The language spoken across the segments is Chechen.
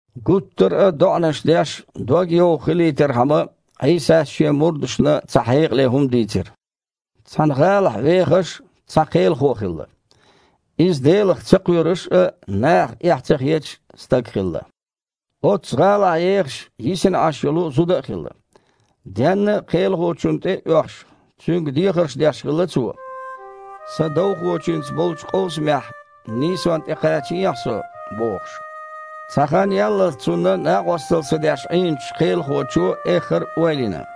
Гуттар а доІанаш деш, догйовха хилийтархьама, Іийсас Шен мурдашна цхьа хьекъале хІума дийцира: «Цхьана гІалахь вехаш цхьа кхелахо хилла. Иза Делах ца кхоьруш а, нахах эхь ца хеташ а стаг хилла. Оццу гІалахь ехаш йисина Іаш йолу зуда а хилла. Денна а кхелахочунна тІе а оьхуш, цуьнга дехарш деш хилла цо: „Сан довхочуьнца болчу къовсамехь нийсонна тІе кхачаехьа со“, – бохуш. Цхьа хан яллалц цунна накъосталла ца деш Іийначу кхелахочо эххар а ойла йина: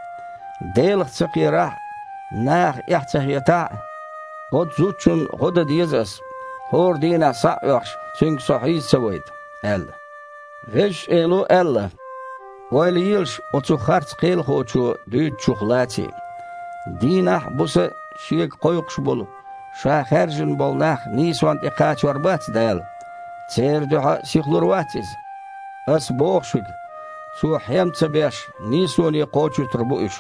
„Делах ца кхерахь а, нахах эхь ца хетахь а, оцу зудчунна гІо дан деза ас, хІора дийнахь схьа а оьхуш, цуьнга со хьийза ца вайта“, – аьлла». Везачу Эло аьлла: «Ойла елаш оцу харц кхелахочо дуьйцучух лаций. Дийнахь а, буса а Шега кхойкхуш болу, Ша хаьржина болу нах нийсонна тІе кхачор бац Дала? Церан дуьхьа сихлур вац Иза? Ас боху шуьга: Цо, хьем ца беш, нийсоне кхочуьйтур бу уьш.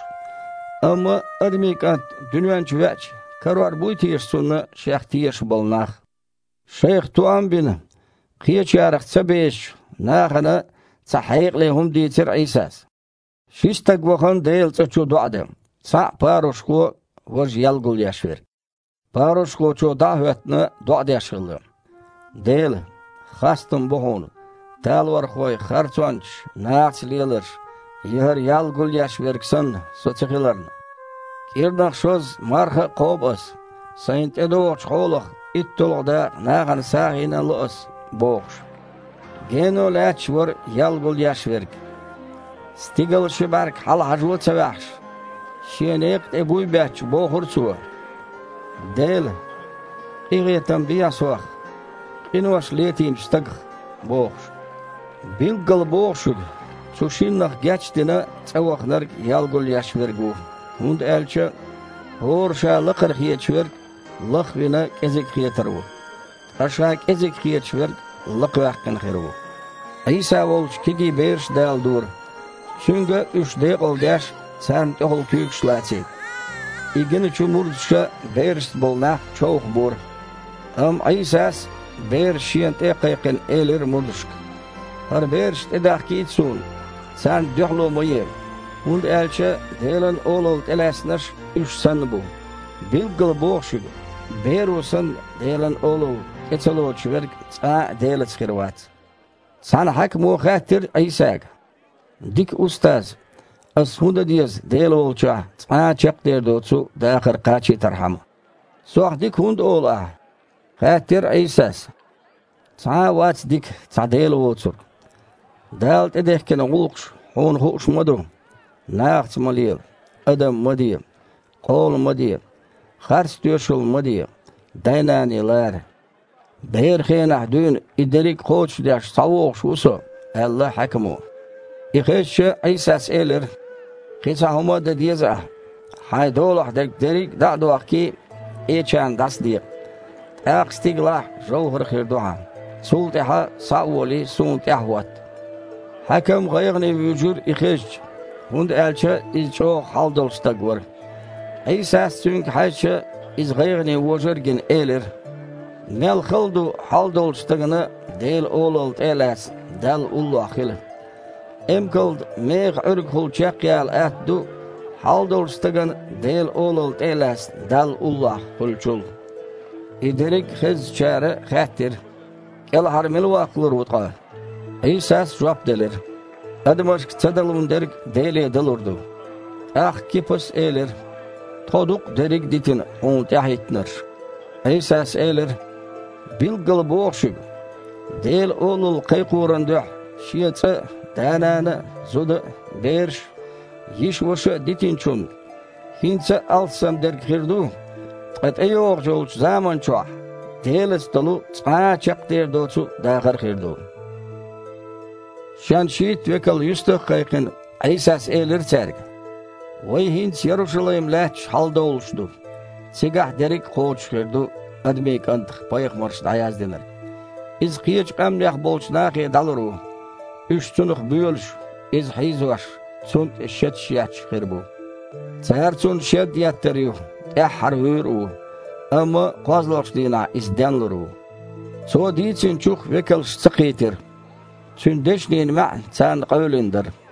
Амма Адамийн КІант дуьнен чу веача, карор буй теша Цунна Шех тешаш болу нах?» Шайх тоам а бина, кхечарах ца бешачу нахана цхьа хьекъале хІума дийцира Іийсас: «Ши стаг вахана Делан цІа чу доІа дан: цхьаъ – парушхо, важа – ял гулъеш верг. Парушхочо, дІа а хІоьттина, доІа деш хилла: „Дела! Хастам бу Хьуна, талорхой, харцончаш, нахаца леларш я хІара ял гулъеш верг санна со ца хиларна. КІирнах шозза марха а кхобу ас, сайн тІедогІучу хьолах уьтталгІа дакъа нахана сагІина а ло ас“, – бохуш. Гено лаьтташ вара ял гулъеш верг. Стигала ши бІаьрг хьала хьажо а ца ваьхьаш, шен некха тІе буй а бетташ, бохура цо: „Дела! Къинхетам бехьа сох, къинош летийначу стагах“, – бохуш. Билггала боху шуьга, цу шиннах геч а дина цІа ваханарг ял гулъеш верг ву. ХІунда аьлча хІора ша лакхара хеташ верг, лах а вина, кІезиг хетар ву, ткъа ша кІезиг хеташ верг лакхаваьккхина хир ву». Іийса волчу кегий бераш а даладора, Цуьнга, уьш декъалдеш, царна тІехула куьйгаш лацийта. И гиначу мурдаша берашца болу нах човхабора. Амма Іийсас, бераш Шена тІе а кхайкхина, элира мурдашка: «ХІара бераш тІедахкийта Суна, царна дуьхьало ма е, хІунда аьлча Делан Олалла тІелаьцнарш уьш санна бу. Билггала боху шуьга: беро санна, Делан Олалла тІе ца лоцуш верг цкъа а Делаца хир вац». Цхьана хьаькамо хаьттира Іийсага: «Дика Устаз! Ас хІун дан деза Дела волчохь цкъа а чекхдер доцу дахар кхачийтархьама?» «Сох „дика“ хІунда олу ахь? – хаьттира Іийсас. – Цхьа а вац дика, цхьа Дела воцург. Дала тІедехкина гІуллакхаш хьуна хууш ма ду: „Нахаца ма лела, адам ма де, къола ма де, харц тоьшалла ма де, дай-наний лара“?» «Беран хенахь дуьйна и дерриг кхочушдеш схьавогІуш ву со», – аьлла хьаькамо. И хезча, Іийсас элира: «Кхин цхьа хІума дан деза ахь: хьайн долахь дерг дерриг дІа а дохкий, къечарна дІасадекъа, тІаккха стигалахь жовхІар хир ду хьан. Цул тІаьхьа, схьа а волий, Суна тІаьхьахІотта». Хьаькам гІайгІане вуьйжира и хезча, хІунда аьлча иза чІогІа хьал долуш стаг вара. Іийсас, цуьнга хьаьжча, иза гІайгІане вожар а гина, элира: «Мел хала ду хьал долчу стагана Делан Олалла тІе а лаьцна, Далла уллохь хила. Эмкална механ Іуьргахула чекхъяла атта ду, хьал долчу стагана Делан Олалла тІе а лаьцна, Далла уллохь хуьлучул». И дерриг хезначара хаьттира: «КІелхьара мила ваккхалур ву ткъа?» Іийсас жоп делира: «Адамашка ца далун дерг Деле далур ду». ТІаккха Кипас элира: «Тхо ду-кх, дерриг а дитина, Хьуна тІаьхьахІиттинарш». Іийсас элира: «Билггала боху шуьга: Делан Олалла кхайкхоран дуьхьа шен цІа а, да-нана а, зуда а, бераш а, йиша-ваша а дитинчунна хІинца а алссам дерг хир ду, ткъа тІейогІу йолчу заман чохь Делаца долу цкъа а чекхдер доцу дахар а хир ду». Шен шийтта векал юьстах а кхайкхина, Іийсас элира цаьрга: «Вай хІинца Ярушалайм лаьттачу хьаладовлуш ду, цигахь дерриг кхочуш хир ду Адамийн КІантах пайхамарша дІаяздинарг. Иза кхечу къаьмнех болчу нахе дІалур ву. Уьш Цунах боьлуш, Иза хьийзош, Цунна тІе шеташ етташ хир бу. Цара Цунна шед еттар ю, тІаьххьара вуьйр а ву, амма кхозлагІчу дийнахь Иза денлур ву». Цо дийцинчух векалш ца кхийтира, Цуьнан дешнийн маьІна царна къевлина дара.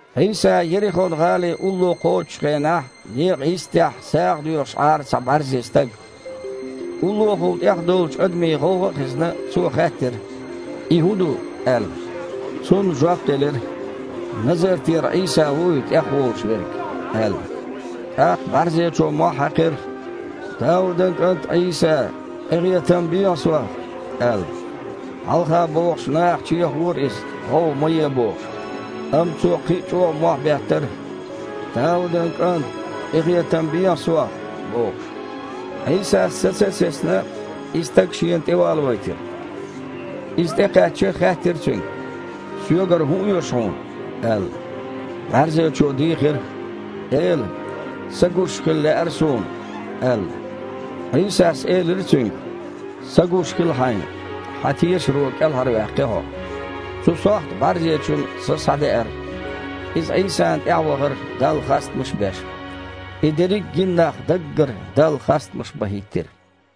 Іийса Ерихон-гІали улло кхочучу хенахь, некъа йистехь сагІа доьхуш Іара цхьа бІаьрзе стаг. Уллохула тІехдовлучу адамийн гІовгІа а хезна, цо хаьттира: «И хІун ду?» – аьлла. Цунна жоп делира: «Назартера Іийса ву и тІехволуш верг», – аьлла. ТІаккха бІаьрзечо мохь хьаькхира: « Даудан кІант Іийса! Къинхетам бехьа сох!» – аьлла. Хьалха богІучу наха чехавора иза, гІовгІа ма е бохуш. Амма цо кхин а чІогІа мохь беттара: «Даудан кІант! Къинхетам бехьа сох!» – бохуш. Іийсас, саца а сецна, и стаг Шена тІевалавайтира. Иза тІекхаьчча, хаьттира цуьнга: «Соьгара хІун оьшу хьуна?» – аьлла. БІаьрзечо дийхира: «Эла! Са гуш хила лаьара суна», – аьлла. Іийсас элира цуьнга: «Са гуш хила хьайна! Хьан тешаро кІелхьарваьккхи хьо». Цу сохьта бІаьрзечун са схьадеара. Иза Іийсана тІаьхьа вахара, Далла хастамаш а беш. И дерриг гина нах даггара Далла хастамаш бан хІиттира.